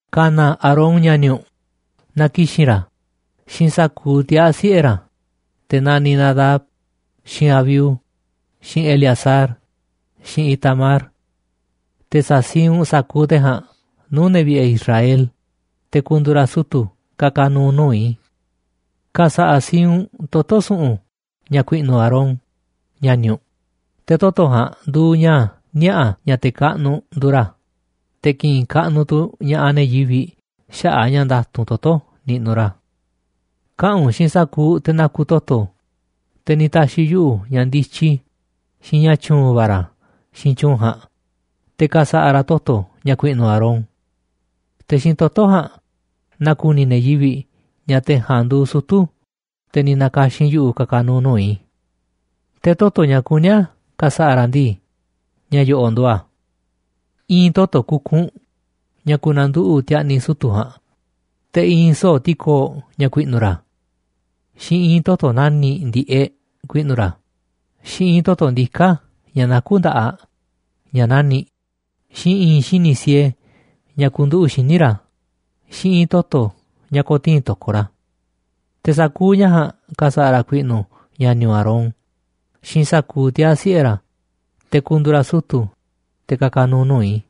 ’Ka̱na̱ Aarón, ña̱ni̱ u̱nꞌ, na ki̱xi̱n ra̱ xiinꞌ sa̱kuuꞌ tiaa̱ siꞌe̱ ra̱, te̱ naniꞌ Nadab, xiinꞌ Abiú, xiinꞌ Eleazar, xiinꞌ Itamar. Te̱ sa̱siinꞌ u̱nꞌ sa̱kuuꞌ te̱ ja̱a̱nꞌ nuu̱ꞌ ne̱ vi̱ꞌe̱ Israel, te̱ ku̱ndu̱u̱ ra̱ sutu̱ ka̱ka̱ nu̱u̱ nuu̱ꞌ i̱. Ka̱sa̱ꞌa̱ siinꞌ u̱nꞌ toto̱ su̱ꞌu̱n ña̱ ku̱i̱ꞌnu̱ Aarón, ña̱ni̱ u̱nꞌ. Te̱ toto̱ ja̱a̱nꞌ nduuꞌ ña̱ niaꞌa̱ ña̱ te̱ kaꞌnuꞌ nduuꞌ ra̱, te̱ ki̱ꞌi̱n kaꞌnuꞌ tu̱ ña̱ꞌaꞌ ne̱ yivi̱ꞌ xaꞌa̱ꞌ a̱ ña̱ nda̱tu̱nꞌ toto̱ niꞌnuꞌ ra̱. Kaꞌa̱n u̱nꞌ xiinꞌ sa̱kuuꞌ te̱ naku toto̱, te̱ ni̱ ta̱xi̱ yuꞌu̱ ña̱ ndityi xiinꞌ ña̱ tyu̱u̱n va̱ ra̱ xiinꞌ tyu̱u̱n ja̱a̱nꞌ, te̱ ka̱sa̱ꞌa̱ ra̱ toto̱ ña̱ ku̱i̱ꞌnu̱ Aarón. Te̱ xiinꞌ toto̱ ja̱a̱nꞌ na̱ku̱ni̱ ne̱ yivi̱ꞌ ña̱ te̱ ja̱a̱nꞌ nduuꞌ sutu̱, te̱ ni̱ na̱ka̱xi̱n yuꞌu̱ ka̱ka̱ nu̱u̱ nuu̱ꞌ i̱. Te̱ toto̱ ña̱ kuní a̱ ka̱sa̱ꞌa̱ ra̱ ndii, ña̱ yo̱ꞌo̱ꞌ nduuꞌ a̱: i̱i̱n toto̱ kukunꞌ ña̱ ku̱na̱nduꞌu̱ꞌ ti̱a̱ꞌni̱ sutu̱ ja̱a̱nꞌ, te̱ i̱i̱n soo̱ꞌ ti̱koo̱ꞌ ña̱ ku̱i̱ꞌnu̱ ra̱, xiinꞌ i̱i̱n toto̱ nani̱ꞌ ndi̱ꞌeꞌ ku̱i̱ꞌnu̱ ra̱, xiinꞌ i̱i̱n toto̱ ndiká ña̱ nakú nda̱ꞌaꞌ ña̱ nani̱ꞌ, xiinꞌ i̱i̱n xini̱ꞌ siee ña̱ ku̱nduꞌu̱ꞌ xíniꞌ ra̱, xiinꞌ i̱i̱n toto̱ ña̱ ko̱tii̱n to̱koꞌ ra̱. Te̱ sa̱kuuꞌ ña̱ ja̱a̱nꞌ ka̱sa̱ꞌa̱ ra̱ ku̱i̱ꞌnu̱ ña̱ni̱ u̱nꞌ, Aarón, xiinꞌ sa̱kuuꞌ tiaa̱ siꞌe̱ ra̱, te̱ ku̱ndu̱u̱ ra̱ sutu̱, te̱ ka̱ka̱ nu̱u̱ nuu̱ꞌ i̱.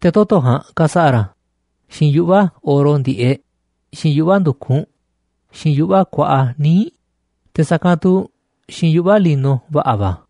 Te̱ toto̱ ja̱a̱nꞌ ka̱sa̱ꞌa̱ ra̱ xiinꞌ yuꞌva̱ oro ndi̱ꞌeꞌ, xiinꞌ yuꞌva̱ ndu̱kunꞌ, xiinꞌ yuꞌva̱ kuaꞌa níiꞌ, te̱ sa̱kanꞌ tu̱ xiinꞌ yuꞌva̱ lino va̱ꞌa̱ va̱.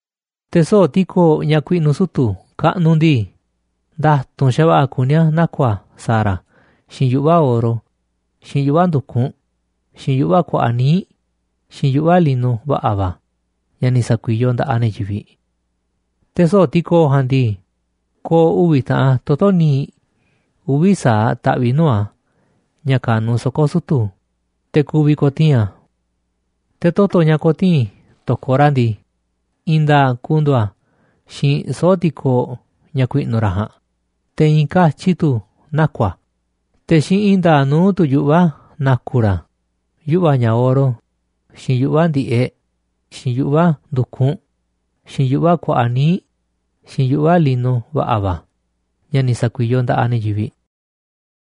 ’Te̱ soo̱ꞌ ti̱koo̱ꞌ ña̱ ku̱i̱ꞌnu̱ sutu̱ kaꞌnuꞌ ndii, nda̱tu̱nꞌ xa̱va̱ꞌa̱ kuní a̱ naku̱ a̱ sa̱a̱ ra̱ xiinꞌ yuꞌva̱ oro, xiinꞌ yuꞌva̱ ndu̱kunꞌ, xiinꞌ yuꞌva̱ kuaꞌa níiꞌ, xiinꞌ yuꞌva̱ lino va̱ꞌa̱ va̱ ña̱ ni̱ sa̱kuiyoꞌ nda̱ꞌaꞌ ne̱ yivi̱ꞌ. Te̱ soo̱ꞌ ti̱koo̱ꞌ ja̱a̱nꞌ ndii, ko̱o̱ uvi̱ taꞌan toto̱ níiꞌ uvi̱ sa̱aꞌ taꞌviꞌ nuu̱ꞌ a̱ ña̱ ka̱nuꞌ soko̱ sutu̱, te̱ ku̱vi̱ ko̱tii̱n a̱. Te̱ toto̱ ña̱ ko̱tii̱n to̱koꞌ ra̱ ndii, i̱i̱n nda̱a̱ꞌ ku̱ndu̱u̱ a̱ xiinꞌ soo̱ꞌ ti̱koo̱ꞌ ña̱ ku̱i̱ꞌnu̱ ra̱ ja̱a̱nꞌ, te̱ i̱i̱n katyi tu̱ naku̱ a̱, te̱ xiinꞌ i̱i̱n nda̱a̱ꞌ nuu̱ꞌ tu̱ yuꞌva̱ na̱ku̱ ra̱ a̱, yuꞌva̱ ña̱ oro, xiinꞌ yuꞌva̱ ndi̱ꞌeꞌ, xiinꞌ yuꞌva̱ ndu̱kunꞌ, xiinꞌ yuꞌva̱ kuaꞌa níiꞌ, xiinꞌ yuꞌva̱ lino va̱ꞌa̱ va̱ ña̱ ni̱ sa̱kuiyoꞌ nda̱ꞌaꞌ ne̱ yivi̱ꞌ.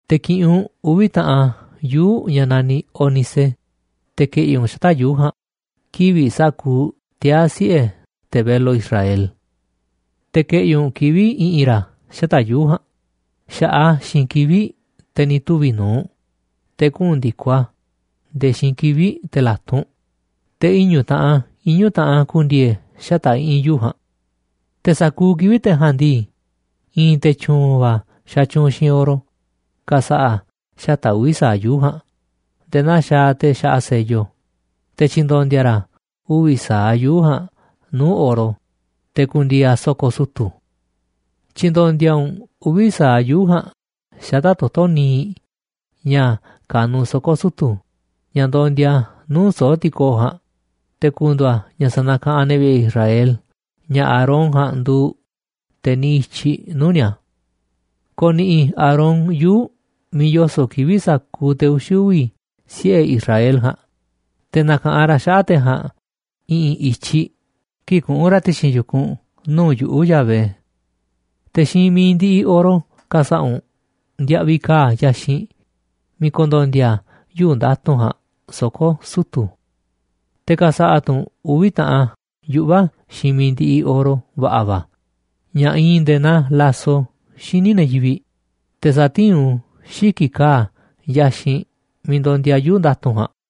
’Te̱ ki̱ꞌi̱n u̱nꞌ uvi̱ taꞌan yuu̱ꞌ ña̱ naniꞌ ónice, te̱ ke̱ꞌi̱ u̱nꞌ xata̱ꞌ yuu̱ꞌ ja̱a̱nꞌ kivi̱ꞌ sa̱kuuꞌ tiaa̱ siꞌe̱ te̱ velo Israel. Te̱ ke̱ꞌi̱ u̱nꞌ kivi̱ꞌ i̱ꞌi̱n ra̱ xata̱ꞌ yuu̱ꞌ ja̱a̱nꞌ xa̱ꞌaꞌ a̱ xiinꞌ kivi̱ꞌ te̱ ni̱ tuvi̱ nu̱uꞌ, te̱ kuꞌu̱n ndi̱koꞌ a̱ nde̱e̱ xiinꞌ kivi̱ꞌ te̱ la̱tunꞌ, te̱ iñu̱ taꞌan iñu̱ taꞌan a̱ ku̱ndi̱e̱e̱ xata̱ꞌ i̱ꞌi̱n yuu̱ꞌ ja̱a̱nꞌ. Te̱ sa̱kuuꞌ kivi̱ꞌ te̱ ja̱a̱nꞌ ndii, i̱i̱n te̱ tyu̱u̱n va̱ xatyuunꞌ xiinꞌ oro ka̱sa̱ꞌa̱ xata̱ꞌ uvi̱ sa̱aꞌ yuu̱ꞌ ja̱a̱nꞌ nde̱e̱ naa xaaꞌ te̱ xaꞌa sello. Te̱ tyi̱ndo̱ndi̱a̱ ra̱ uvi̱ sa̱aꞌ yuu̱ꞌ ja̱a̱nꞌ nuu̱ꞌ oro, te̱ ku̱ndi̱e̱e̱ a̱ soko̱ sutu̱. Tyi̱ndo̱ndi̱a̱ u̱nꞌ uvi̱ sa̱aꞌ yuu̱ꞌ ja̱a̱nꞌ xata̱ꞌ toto̱ níiꞌ ña̱ ka̱nuꞌ soko̱ sutu̱, ña̱ ndondia nuu̱ꞌ soo̱ꞌ ti̱koo̱ꞌ ja̱a̱nꞌ, te̱ ku̱ndu̱u̱ a̱ ña̱ sanakaꞌanꞌ ne̱ vi̱ꞌe̱ Israel ña̱ Aarón ja̱a̱nꞌ nduuꞌ te̱ niꞌiꞌ i̱tyiꞌ nuu̱ꞌ ni̱a̱. Ko̱ꞌni̱ꞌi̱ Aarón yuu̱ꞌ miiꞌ yoso̱ꞌ kivi̱ꞌ sa̱kuuꞌ te̱ uxi̱ uvi̱ siꞌe̱ Israel ja̱a̱nꞌ, te̱ na̱ka̱ꞌanꞌ ra̱ xaꞌa̱ꞌ te̱ ja̱a̱nꞌ i̱ꞌi̱n i̱tyiꞌ kii̱ꞌ kuꞌu̱n ra̱ ti̱xi̱n yu̱kunꞌ nuu̱ꞌ yuꞌu̱ꞌ, Yahvé. Te̱ xiinꞌ mi̱iꞌ ndiꞌiꞌ oro ka̱sa̱ꞌa̱ u̱nꞌ ndiaꞌviꞌ ka̱a̱ yaxinꞌ miiꞌ ku̱ndo̱ndi̱a̱ yuu̱ꞌ nda̱tu̱nꞌ ja̱a̱nꞌ soko̱ sutu̱. Te̱ ka̱sa̱ꞌa̱ tu̱ u̱nꞌ uvi̱ taꞌan yuꞌva̱ xiinꞌ mi̱iꞌ ndiꞌiꞌ oro va̱ꞌa̱ va̱ ña̱ iinꞌ nde̱e̱ naa laso xíniꞌ ne̱ yivi̱ꞌ, te̱ sa̱tiín u̱nꞌ u̱n xíki̱ꞌ ka̱a̱ yaxinꞌ miiꞌ ndondia yuu̱ꞌ nda̱tu̱nꞌ ja̱a̱nꞌ.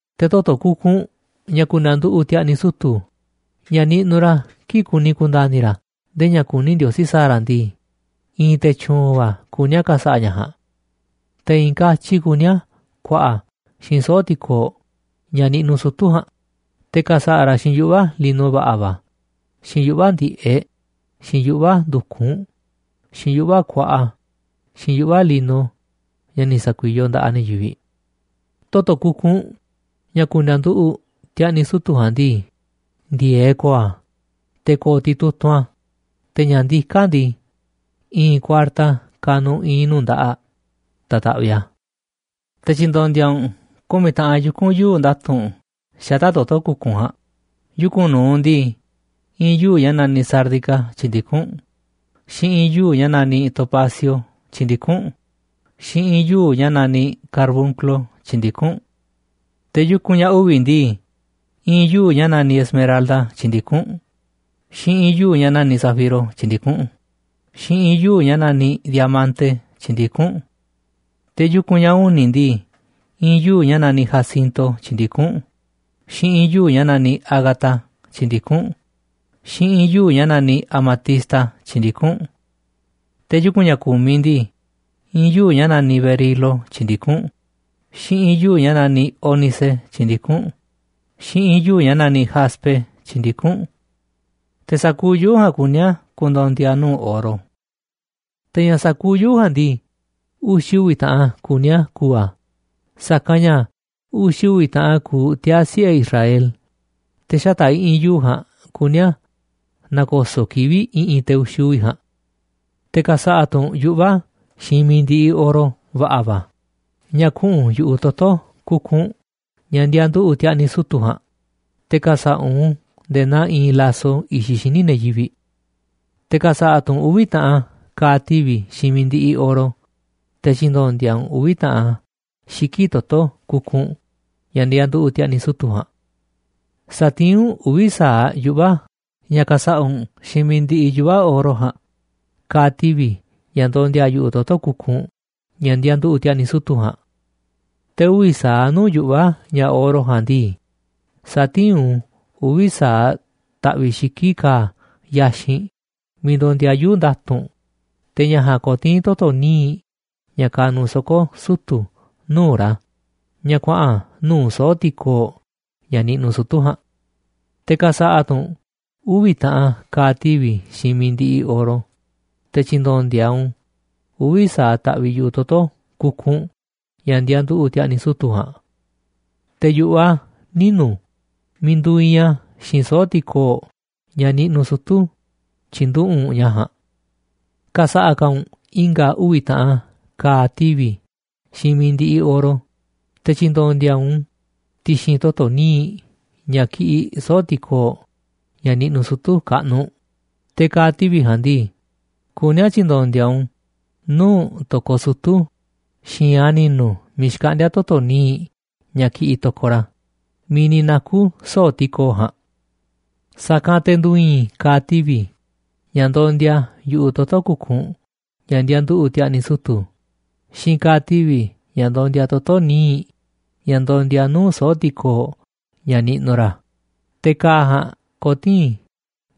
’Te̱ toto̱ kukunꞌ ña̱ ku̱nda̱nduꞌu̱ꞌ ti̱a̱ꞌni̱ sutu̱ ña̱ niꞌnuꞌ ra̱ kii̱ꞌ kuni ku̱nda̱ni̱ ra̱ ndee ña̱ kuní Ndiosí sa̱a̱ ra̱ ndii, i̱i̱n te̱ tyu̱u̱n va̱ kuní a̱ ka̱sa̱ꞌa̱ ña̱ ja̱a̱nꞌ. Te̱ i̱i̱n katyi kuní a̱ ku̱a̱ꞌa̱ a̱ xiinꞌ soo̱ꞌ ti̱koo̱ꞌ ña̱ niꞌnuꞌ sutu̱ ja̱a̱nꞌ, te̱ ka̱sa̱ꞌa̱ ra̱ xiinꞌ yuꞌva̱ lino va̱ꞌa̱ va̱, xiinꞌ yuꞌva̱ ndi̱ꞌeꞌ, xiinꞌ yuꞌva̱ ndu̱kunꞌ, xiinꞌ yuꞌva̱ kuaꞌa, xiinꞌ yuꞌva̱ lino ña̱ ni̱ sa̱kuiyoꞌ nda̱ꞌaꞌ ne̱ yivi̱ꞌ. Toto̱ kukunꞌ ña̱ ku̱nda̱nduꞌu̱ꞌ ti̱a̱ꞌni̱ sutu̱ ja̱a̱nꞌ ndii, ndi̱e̱eꞌ ko̱o̱ a̱, te̱ ko̱o̱ titutunꞌ tu̱ a̱, te̱ ña̱ ndiká a̱ ndii, i̱i̱n kuarta kanuꞌ i̱i̱n nuu̱ꞌ nda̱ꞌaꞌ ta̱taꞌviꞌ a̱. Te̱ tyi̱ndo̱ndi̱a̱ u̱nꞌ ku̱miꞌ taꞌan yuku̱n yuu̱ꞌ nda̱tu̱nꞌ xata̱ꞌ toto̱ kukunꞌ ja̱a̱nꞌ. Yuku̱n nu̱uꞌ ndii, i̱i̱n yuu̱ꞌ ña̱ naniꞌ sárdica tyi̱ndikún u̱nꞌ, xiinꞌ i̱i̱n yuu̱ꞌ ña̱ naniꞌ topacio tyi̱ndikún u̱nꞌ, xiinꞌ i̱i̱n yuu̱ꞌ ña̱ naniꞌ carbunclo tyi̱ndikún u̱nꞌ. Te̱ yuku̱n ña̱ uvi̱ ndii, i̱i̱n yuu̱ꞌ ña̱ naniꞌ esmeralda, tyi̱ndikún u̱nꞌ, xiinꞌ i̱i̱n yuu̱ꞌ ña̱ naniꞌ zafiro tyi̱ndikún u̱nꞌ, xiinꞌ i̱i̱n yuu̱ꞌ ña̱ naniꞌ diamante tyi̱ndikún u̱nꞌ. Te̱ yuku̱n ña̱ uni̱ ndii, i̱i̱n yuu̱ꞌ ña̱ naniꞌ jacinto tyi̱ndikún u̱nꞌ, xiinꞌ i̱i̱n yuu̱ꞌ ña̱ naniꞌ ágata tyi̱ndikún u̱nꞌ, xiinꞌ i̱i̱n yuu̱ꞌ ña̱ naniꞌ amatista tyi̱ndikún u̱nꞌ. Te̱ yuku̱n ña̱ ku̱miꞌ ndii, i̱i̱n yuu̱ꞌ ña̱ naniꞌ berilo tyi̱ndikún u̱nꞌ, xiinꞌ i̱i̱n yuu̱ꞌ ña̱ naniꞌ ónice tyi̱ndikún u̱nꞌ, xiinꞌ i̱i̱n yuu̱ꞌ ña̱ naniꞌ jaspe tyi̱ndikún u̱nꞌ. Te̱ sa̱kuuꞌ yuu̱ꞌ ja̱a̱nꞌ kuní a̱ ku̱ndo̱ndi̱a̱ nuu̱ꞌ oro. Te̱ ña̱ sa̱kuuꞌ yuu̱ꞌ ja̱a̱nꞌ ndii, uxi̱ uvi̱ taꞌan kuní a̱ ku̱u̱ a̱, sa̱kanꞌ ña̱ uxi̱ uvi̱ taꞌan kuuꞌ tiaa̱ siꞌe̱ Israel, te̱ xata̱ꞌ i̱ꞌi̱n yuu̱ꞌ ja̱a̱nꞌ kuní a̱ na̱ko̱so̱ꞌ kivi̱ꞌ i̱ꞌi̱n te̱ uxi̱ uvi̱ ja̱a̱nꞌ. ’Te̱ ka̱sa̱ꞌa̱ tu̱ u̱nꞌ yuꞌva̱ xiinꞌ mi̱iꞌ ndiꞌiꞌ oro va̱ꞌa̱ va̱ ña̱ kuꞌu̱n yu̱ꞌuꞌ toto̱ kukunꞌ ña̱ ndianduꞌu̱ꞌ ti̱a̱ꞌni̱ sutu̱ ja̱a̱nꞌ, te̱ ka̱sa̱ꞌa̱ u̱nꞌ u̱n nde̱e̱ naa iinꞌ laso i̱xiꞌ xíniꞌ ne̱ yivi̱ꞌ. Te̱ ka̱sa̱ꞌa̱ tu̱ u̱nꞌ uvi̱ taꞌan ka̱a̱ tivi̱ xiinꞌ mi̱iꞌ ndiꞌiꞌ oro, te̱ tyi̱ndo̱ndi̱a̱ u̱nꞌ uvi̱ taꞌan a̱ xiki̱ꞌ toto̱ kukunꞌ ña̱ ndianduꞌu̱ꞌ ti̱a̱ꞌni̱ sutu̱ ja̱a̱nꞌ. Sa̱tiín u̱nꞌ uvi̱ sa̱aꞌ yuꞌva̱ ña̱ ka̱sa̱ꞌa̱ u̱nꞌ xiinꞌ mi̱iꞌ ndiꞌiꞌ yuꞌva̱ oro ja̱a̱nꞌ, ka̱a̱ tivi̱ ña̱ ndondia yu̱ꞌuꞌ toto̱ kukunꞌ ña̱ ndianduꞌu̱ꞌ ti̱a̱ꞌni̱ sutu̱ ja̱a̱nꞌ. Te̱ uvi̱ sa̱aꞌ nuu̱ꞌ yuꞌva̱ ña̱ oro ja̱a̱nꞌ ndii, sa̱tiín u̱nꞌ u̱n uvi̱ sa̱aꞌ taꞌviꞌ xiki̱ꞌ ka̱a̱ yaxinꞌ miiꞌ ndondia yuu̱ꞌ nda̱tu̱nꞌ, te̱ ña̱ ja̱a̱nꞌ ko̱tii̱n toto̱ níiꞌ ña̱ kanuꞌ soko̱ sutu̱ nuu̱ꞌ ra̱ ña̱ kuaꞌa̱n nuu̱ꞌ soo̱ꞌ ti̱koo̱ꞌ ña̱ niꞌnuꞌ sutu̱ ja̱a̱nꞌ. Te̱ ka̱sa̱ꞌa̱ tu̱ u̱nꞌ uvi̱ taꞌan ka̱a̱ tivi̱ xiinꞌ mi̱iꞌ ndiꞌiꞌ oro, te̱ tyi̱ndo̱ndi̱a̱ u̱nꞌ u̱n uvi̱ sa̱aꞌ taꞌviꞌ yu̱ꞌuꞌ toto̱ kukunꞌ ña̱ ndianduꞌu̱ꞌ ti̱a̱ꞌni̱ sutu̱ ja̱a̱nꞌ. Te̱ yu̱ꞌuꞌ a̱ ninu̱ miiꞌ nduuꞌ iinꞌ a̱ xiinꞌ soo̱ꞌ ti̱koo̱ꞌ ña̱ niꞌnuꞌ sutu̱ tyi̱nduꞌu̱ꞌ u̱nꞌ ña̱ ja̱a̱nꞌ. Ka̱sa̱ꞌa̱ ka̱ u̱nꞌ i̱nga̱ uvi̱ taꞌan ka̱a̱ tivi̱ xiinꞌ mi̱iꞌ ndiꞌiꞌ oro, te̱ tyi̱ndo̱ndi̱a̱ u̱nꞌ u̱n ti̱xi̱n toto̱ níiꞌ ña̱ kiꞌiꞌ soo̱ꞌ ti̱koo̱ꞌ, ña̱ niꞌnuꞌ sutu̱ kaꞌnuꞌ. Te̱ ka̱a̱ tivi̱ ja̱a̱nꞌ ndii, kuní a̱ tyi̱ndo̱ndi̱a̱ u̱nꞌ u̱n nuu̱ꞌ to̱koꞌ sutu̱ xi̱i̱nꞌ a̱ ni̱nu̱ miiꞌ xkaꞌndíá toto̱ níiꞌ ña̱ kiꞌiꞌ to̱koꞌ ra̱ miiꞌ ni̱ naku̱ soo̱ꞌ ti̱koo̱ꞌ ja̱a̱nꞌ. Sa̱kanꞌ te̱ ndu̱i̱i̱n ka̱a̱ tivi̱ ña̱ ndondia yu̱ꞌuꞌ toto̱ kukunꞌ ña̱ ndianduꞌu̱ꞌ ti̱a̱ꞌni̱ sutu̱ꞌ xiinꞌ ka̱a̱ tivi̱ ña̱ ndondia toto̱ níiꞌ ña̱ ndondia nuu̱ꞌ soo̱ꞌ ti̱koo̱ꞌ ña̱ niꞌnuꞌ ra̱. Te̱ ka̱a̱ ja̱a̱nꞌ ko̱tii̱n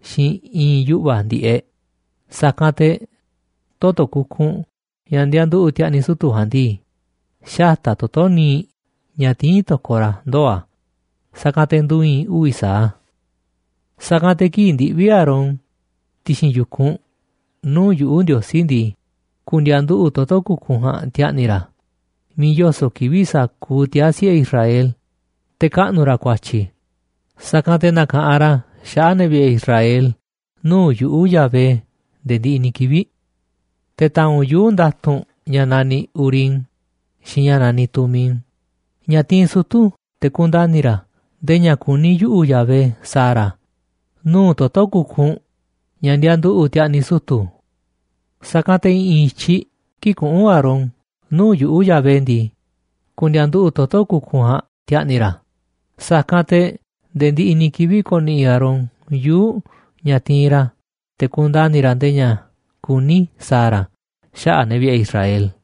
xiinꞌ i̱i̱n yuꞌva̱ ndi̱ꞌeꞌ, sa̱kanꞌ te̱ toto̱ kukunꞌ ña̱ ndianduꞌu̱ꞌ ti̱a̱ꞌni̱ sutu̱ꞌ ja̱a̱nꞌ ndii, xata̱ꞌ toto̱ níiꞌ ña̱ tiín to̱koꞌ ra̱ ndoo̱ a̱, sa̱kanꞌ te̱ ndu̱i̱i̱n uvi̱ sa̱aꞌ a̱. ’Sa̱kanꞌ te̱ kii̱ꞌ ndiꞌvi̱ Aarón ti̱xi̱n yu̱kunꞌ nuu̱ꞌ yuꞌu̱, Ndiosí ndii, ku̱ndi̱a̱nduꞌu̱ꞌ toto̱ kukunꞌ ja̱a̱nꞌ ti̱a̱ꞌni̱ ra̱ miiꞌ yoso̱ꞌ kivi̱ꞌ sa̱kuuꞌ tiaa̱ siꞌe̱ Israel, te̱ kaꞌnu̱ ra̱ ku̱a̱tyi̱, sa̱kanꞌ te̱ na̱ka̱ꞌanꞌ ra̱ xaꞌa̱ꞌ ne̱ vi̱ꞌe̱ Israel nuu̱ꞌ yuꞌu̱, Yahvé, nde̱e̱ ndiꞌiꞌ ni̱ kivi̱ꞌ. Te̱ ta̱a̱nꞌ u̱nꞌ yuu̱ꞌ nda̱tu̱nꞌ ña̱ naniꞌ urim xiinꞌ ña̱ naniꞌ tumim, ña̱ tiinꞌ sutu̱ te̱ kundani̱ ra̱ ndee ña̱ kuní yuꞌu̱, Yahvé, sa̱a̱ ra̱ nuu̱ꞌ toto̱ kukunꞌ ña̱ ndianduꞌu̱ꞌ ti̱a̱ꞌni̱ sutu̱ꞌ. Sa̱kanꞌ te̱ i̱ꞌi̱n i̱tyiꞌ kii̱ꞌ kuꞌu̱n Aarón nuu̱ꞌ yuꞌu̱, Yahvé ndii, ku̱ndi̱a̱nduꞌu̱ꞌ toto̱ kukunꞌ ja̱a̱nꞌ ti̱a̱ꞌni̱ ra̱, sa̱kanꞌ te̱ nde̱e̱ ndiꞌiꞌ ni̱ kivi̱ꞌ ko̱ni̱ꞌi̱ Aarón yuu̱ꞌ ña̱ tiinꞌ ra̱ te̱ kundani̱ ra̱ ndee ña̱ kuní i̱ sa̱a̱ ra̱ xaꞌa̱ꞌ ne̱ vi̱ꞌe̱ Israel.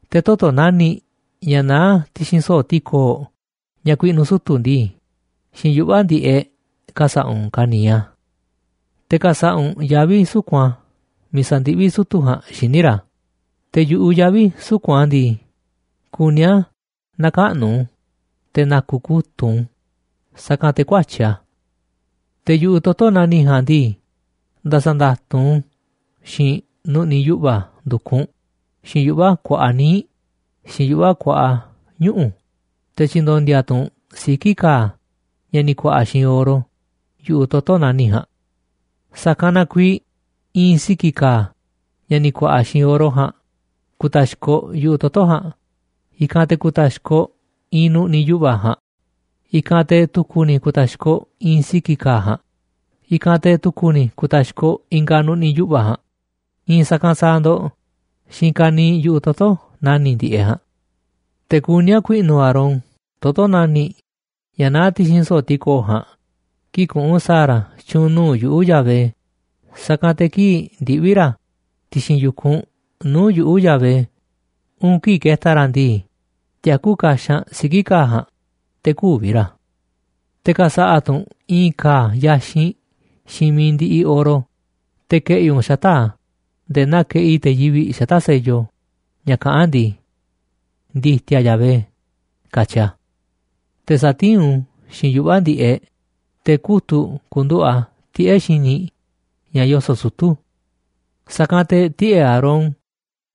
’Te̱ toto̱ nani̱ꞌ ña̱ naá ti̱xi̱n soo̱ꞌ ti̱koo̱ꞌ ña̱ ku̱i̱ꞌnu̱ sutu̱ ndii, xiinꞌ yuꞌva̱ ndi̱ꞌeꞌ ka̱sa̱ꞌa̱ u̱nꞌ ka̱niiꞌ a̱. Te̱ ka̱sa̱ꞌa̱ u̱nꞌ yavi̱ suku̱nꞌ a̱ miiꞌ sa̱ndiꞌví sutu̱ ja̱a̱nꞌ xíniꞌ ra̱, te̱ yu̱ꞌuꞌ yavi̱ suku̱nꞌ a̱ ja̱a̱nꞌ ndii, kuní a̱ na̱kaꞌnu̱ u̱nꞌ te̱ na̱ku̱ kutu̱ꞌ u̱nꞌ u̱n, sa̱kanꞌ te̱ ku̱ä̱tyi̱ a̱. Te̱ yu̱ꞌuꞌ toto̱ nani̱ꞌ ja̱a̱nꞌ ndii, nda̱sa̱nda̱tu̱nꞌ u̱nꞌ u̱n xiinꞌ nu̱ꞌni̱ yuꞌva̱ ndu̱kunꞌ, xiinꞌ yuꞌva̱ kuaꞌa níiꞌ, xiinꞌ yuꞌva̱ kuaꞌa ñuꞌu̱, te̱ tyi̱ndo̱ndi̱a̱ tu̱ u̱nꞌ siki̱ ka̱a̱ ña̱ ni̱ ku̱a̱ꞌa̱ xiinꞌ oro yu̱ꞌuꞌ toto̱ nani̱ꞌ ja̱a̱nꞌ. Sa̱kanꞌ na kuiiꞌ i̱i̱n siki̱ ka̱a̱, ña̱ ni̱ ku̱a̱ꞌa̱ xiinꞌ oro ja̱a̱nꞌ, ku̱i̱ta̱xkoꞌ yu̱ꞌuꞌ toto̱ ja̱a̱nꞌ, i̱kanꞌ te̱ ku̱ta̱xkoꞌ i̱i̱n nu̱ꞌni̱ yuꞌva̱ ja̱a̱nꞌ, i̱kanꞌ te̱ tu̱ku̱ ni̱ ku̱ta̱xkoꞌ i̱i̱n siki̱ ka̱a̱ ja̱a̱nꞌ, i̱kanꞌ te̱ tu̱ku̱ ni̱ ku̱ta̱xkoꞌ i̱nga̱ nu̱ꞌni̱ yuꞌva̱ ja̱a̱nꞌ, i̱i̱n sa̱kanꞌ sa̱a̱ ndo̱ꞌ xiinꞌ ka̱niiꞌ yu̱ꞌuꞌ toto̱ nani̱ꞌ ndi̱ꞌeꞌ ja̱a̱nꞌ. Te̱ kuní a̱ ku̱i̱ꞌnu̱ Aarón toto̱ nani̱ꞌ ña̱ naá ti̱xi̱n soo̱ꞌ ti̱koo̱ꞌ ja̱a̱nꞌ kii̱ꞌ kuꞌu̱n sa̱a̱ ra̱ tyu̱u̱n nuu̱ꞌ yuꞌu̱, Yahvé, sa̱kanꞌ te̱ kii̱ꞌ ndiꞌvi̱ ra̱ ti̱xi̱n yu̱kunꞌ nuu̱ꞌ yuꞌu̱, Yahvé, uun kii̱ꞌ ke̱ta̱ ra̱ ndii, tiakú kaxanꞌ siki̱ ka̱a̱ ja̱a̱nꞌ, te̱ kü̱vi̱ ra̱. ’Te̱ ka̱sa̱ꞌa̱ tu̱ u̱nꞌ i̱i̱n ka̱a̱ yaxinꞌ xiinꞌ mi̱iꞌ ndiꞌiꞌ oro, te̱ ke̱ꞌi̱ u̱nꞌ xata̱ꞌ a̱ nde̱e̱ naa keꞌi te̱ yivi̱ꞌ xata̱ꞌ sello ña̱ kaꞌán ndii: “Ndi̱ti̱a̱ Yahvé”, katyi a̱. Te̱ sa̱tiín u̱nꞌ u̱n xiinꞌ yuꞌva̱ ndi̱ꞌeꞌ, te̱ kutu̱ꞌ ku̱nduꞌu̱ꞌ a̱ tiꞌe̱ꞌ xíniꞌ ña̱ yoso̱ꞌ sutu̱. Sa̱kanꞌ te̱ tiꞌe̱ꞌ Aarón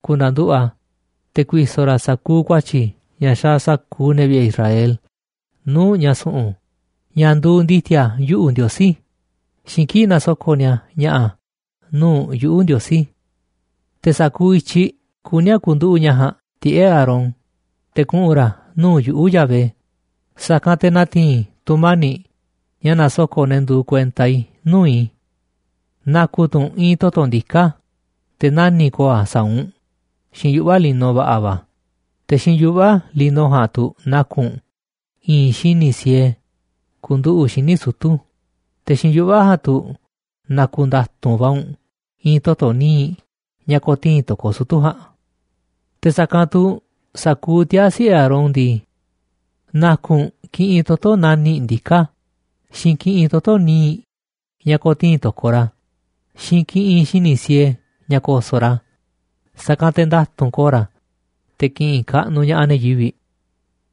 ku̱na̱nduꞌu̱ꞌ a̱, te̱ ku̱i̱so̱ ra̱ sa̱kuuꞌ ku̱a̱tyi̱ ña̱ xaaꞌ sa̱kuuꞌ ne̱ vi̱ꞌe̱ Israel nuu̱ꞌ ña̱ su̱ꞌu̱n, ña̱ nduuꞌ ndi̱ti̱a̱ yuꞌu̱, Ndiosí, xiinꞌ kii̱ꞌ nasoko̱ꞌ ni̱a̱ ña̱ꞌa̱ nuu̱ꞌ yuꞌu̱, Ndiosí. Te̱ sa̱kuuꞌ i̱tyiꞌ kuní a̱ ku̱nduꞌu̱ꞌ ña̱ ja̱a̱nꞌ tiꞌe̱ꞌ Aarón te̱ kuꞌu̱n ra̱ nuu̱ꞌ yuꞌu̱, Yahvé, sa̱kanꞌ te̱ na̱ti̱i̱n i̱ tu̱mani̱ꞌ ña̱ nasoko̱ꞌ ne̱ nduuꞌ kuenta i̱, nuu̱ꞌ i̱. Na̱ku̱ tu̱ u̱nꞌ i̱i̱n toto̱ ndiká, te̱ nani̱ꞌ ko̱o̱ a̱ saa̱ u̱nꞌ xiinꞌ yuꞌva̱ lino va̱ꞌa̱ va̱. Te̱ xiinꞌ yuꞌva̱ lino ja̱a̱nꞌ tu̱ na̱ku̱ u̱nꞌ i̱i̱n xíniꞌ siee ku̱nduꞌu̱ꞌ xíniꞌ sutu̱, te̱ xiinꞌ yuꞌva̱ ja̱a̱nꞌ tu̱ na̱ku̱ nda̱tu̱nꞌ va̱ u̱nꞌ i̱i̱n toto̱ níiꞌ ña̱ ko̱tii̱n to̱koꞌ sutu̱ ja̱a̱nꞌ. ’Te̱ sa̱kanꞌ tu̱ sa̱kuuꞌ tiaa̱ siꞌe̱ Aarón ndii, na̱ku̱ u̱nꞌ kiꞌinꞌ toto̱ nani̱ꞌ ndiká, xiinꞌ kiꞌinꞌ toto̱ níiꞌ ña̱ ko̱tii̱n to̱koꞌ ra̱, xiinꞌ kiꞌinꞌ xíniꞌ siee ña̱ ko̱so̱ꞌ ra̱, sa̱kanꞌ te̱ nda̱tu̱nꞌ ko̱o̱ ra̱, te̱ ki̱ꞌi̱n kaꞌnuꞌ ña̱ꞌaꞌ ne̱ yivi̱ꞌ.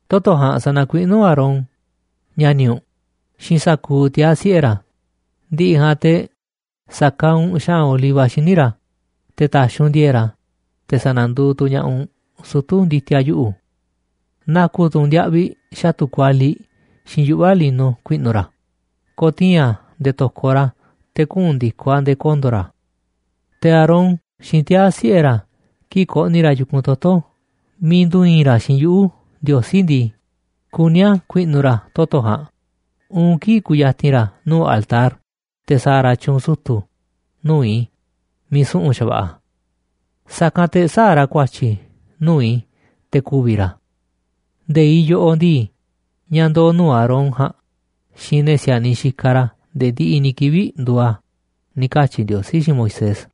Toto̱ ja̱a̱nꞌ sa̱na̱kuiꞌnú u̱nꞌ Aarón, ña̱ni̱ u̱nꞌ, xiinꞌ sa̱kuuꞌ tiaa̱ siꞌe̱ ra̱. Ndi̱ꞌi̱ ja̱a̱nꞌ te̱ sa̱kaaꞌ u̱nꞌ xa̱ꞌa̱n oliva xíniꞌ ra̱ te̱ ta̱xi̱ u̱nꞌ ndi̱e̱e̱ꞌ ra̱, te̱ sa̱na̱duuꞌ tu̱ ña̱ꞌaꞌ u̱nꞌ sutu̱ ndi̱ti̱a̱ yuꞌu̱. Na̱ku̱ tu̱ u̱nꞌ ndiaꞌviꞌ xa̱tu̱ kualiꞌ xiinꞌ yuꞌva̱ lino ku̱i̱ꞌnu̱ ra̱ ko̱tii̱n a̱ nde̱e̱ to̱koꞌ ra̱, te̱ kuꞌu̱n ndi̱koꞌ a̱ nde̱e̱ kondo̱ ra̱. Te̱ Aarón xiinꞌ tiaa̱ siꞌe̱ ra̱, kii̱ꞌ ko̱ꞌni̱ ra̱ yu̱kunꞌ toto̱ miiꞌ ndu̱i̱i̱n ra̱ xiinꞌ yuꞌu̱, Ndiosí ndii, kuní a̱ ku̱i̱ꞌnu̱ ra̱ toto̱ ja̱a̱nꞌ uun kii̱ꞌ ku̱ya̱ti̱n ra̱ nuu̱ꞌ altar te̱ sa̱a̱ ra̱ tyu̱u̱n sutu̱ nuu̱ꞌ i̱ miiꞌ su̱ꞌu̱n xa̱va̱ꞌa̱. Sa̱kanꞌ te̱ sä̱a̱ ra̱ ku̱a̱tyi̱ nuu̱ꞌ i̱ te̱ ku̱vi̱ ra̱. Nde̱iꞌ yoꞌoꞌ ndii, ña̱ ndoo̱ nuu̱ꞌ Aarón ja̱a̱nꞌ xiinꞌ ne̱ si̱a̱niꞌ xikaꞌ ra̱ nde̱e̱ ndiꞌiꞌ ni̱ kivi̱ꞌ nduuꞌ a̱ ―ni̱ katyi̱ Ndiosí xiinꞌ Moisés.